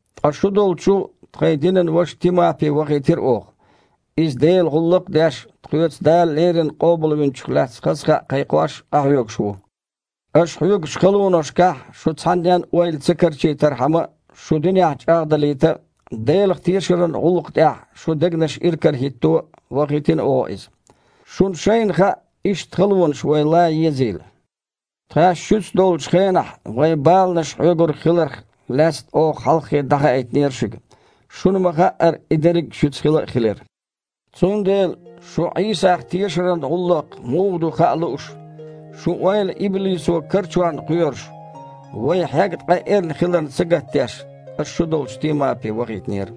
Ткъа шу долчу тхайн динан ваша Тимапи вахийтира оха. Иза Делан гІуллакх а деш, тхоьца Дала леррина Къобалвинчух лаьцна хаза кхаъ кхайкхош къахьоьгуш ву. Аша хьоьгучу халонашкахь шун цхьаннен а ойла ца карчийтархьама, шу динехь чІагІдалийта а, Делах тешаран гІуллакхна тІехь шун дегнаш иракарахІитто а вахийтина оха иза. Шуна шайна хаьа, иштта халонаш вай лан езийла. Тхаьш шуьца долчу хенахь, вай баланаш хьоьгург хиларх лаьцна оха хьалххе дІахаийтинера шуьга. Шуна ма-хаъара, и дерриг а шуьца хила а хилира. Цундела, шун Іийсах тешаран гІуллакх муха ду хаа лууш, шун ойла иблисо карчорна кхоьруш, вай хьегна къа эрна хиларна сагатдеш, аса шу долчу Тимапи вахийтинера.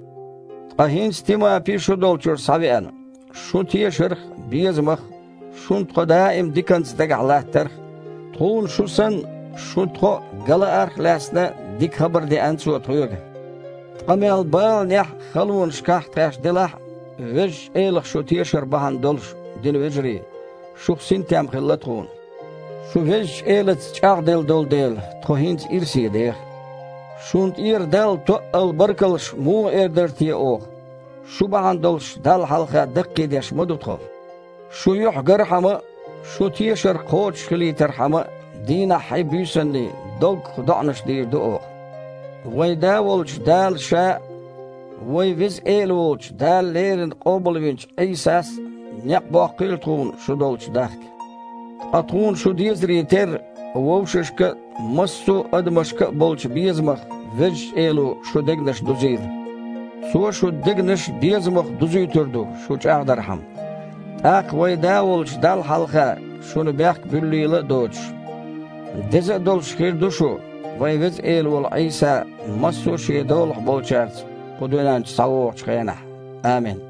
Ткъа хІинца Тимапи шу долчуьра схьавеана. Шун тешарх а, безамах а, шуна тхо даим а диканца дагахь латтарх а, тхуна шу санна, шуна а тхо ган лаарх а лаьцна дика хабар деана цо тхоьга. Ткъа мел баланехь а, халонашкахь а тхаьш делахь а, Везачу Элах шу тешар бахьана долуш, динан вежарий, шух синтем хилла тхуна. Шу Везачу Элаца чІагІделла долу дела, тхо хІинца ирсе деха. Шуна тІера Далла тоъал баркаллаш муха эр дара те оха? Шу бахьана долуш Далла хьалха даккхийдеш ма ду тхо. Шун юьхь гархьама а, шун тешар кхочушхилийтархьама а, дийнаххьий, буьйсанний доггах доІанаш дийр ду оха. Вайн Да волчу Дала Ша а, Вайн Веза Эла волчу Дала леррина къобалвинчу Іийсас а некъ боккхийла тхуна шу долчу дахка. Ткъа тхуна шу дезаре терра, вовшашка а, массо а адамашка а болчу безамах Везачу Эло шун дегнаш дузийла. Цо шун дегнаш безамах дузуьйтур ду, шу чІагІдархьама. ТІаккха вайн Да волчу Далла хьалха шуна бехк буьллийла а доцуш, деза а долуш хир ду шу, вайн Веза Эла волу Іийса, массо а Шен долахь болчаьрца кху дуьнен чу схьавогІучу хенахь. Амин.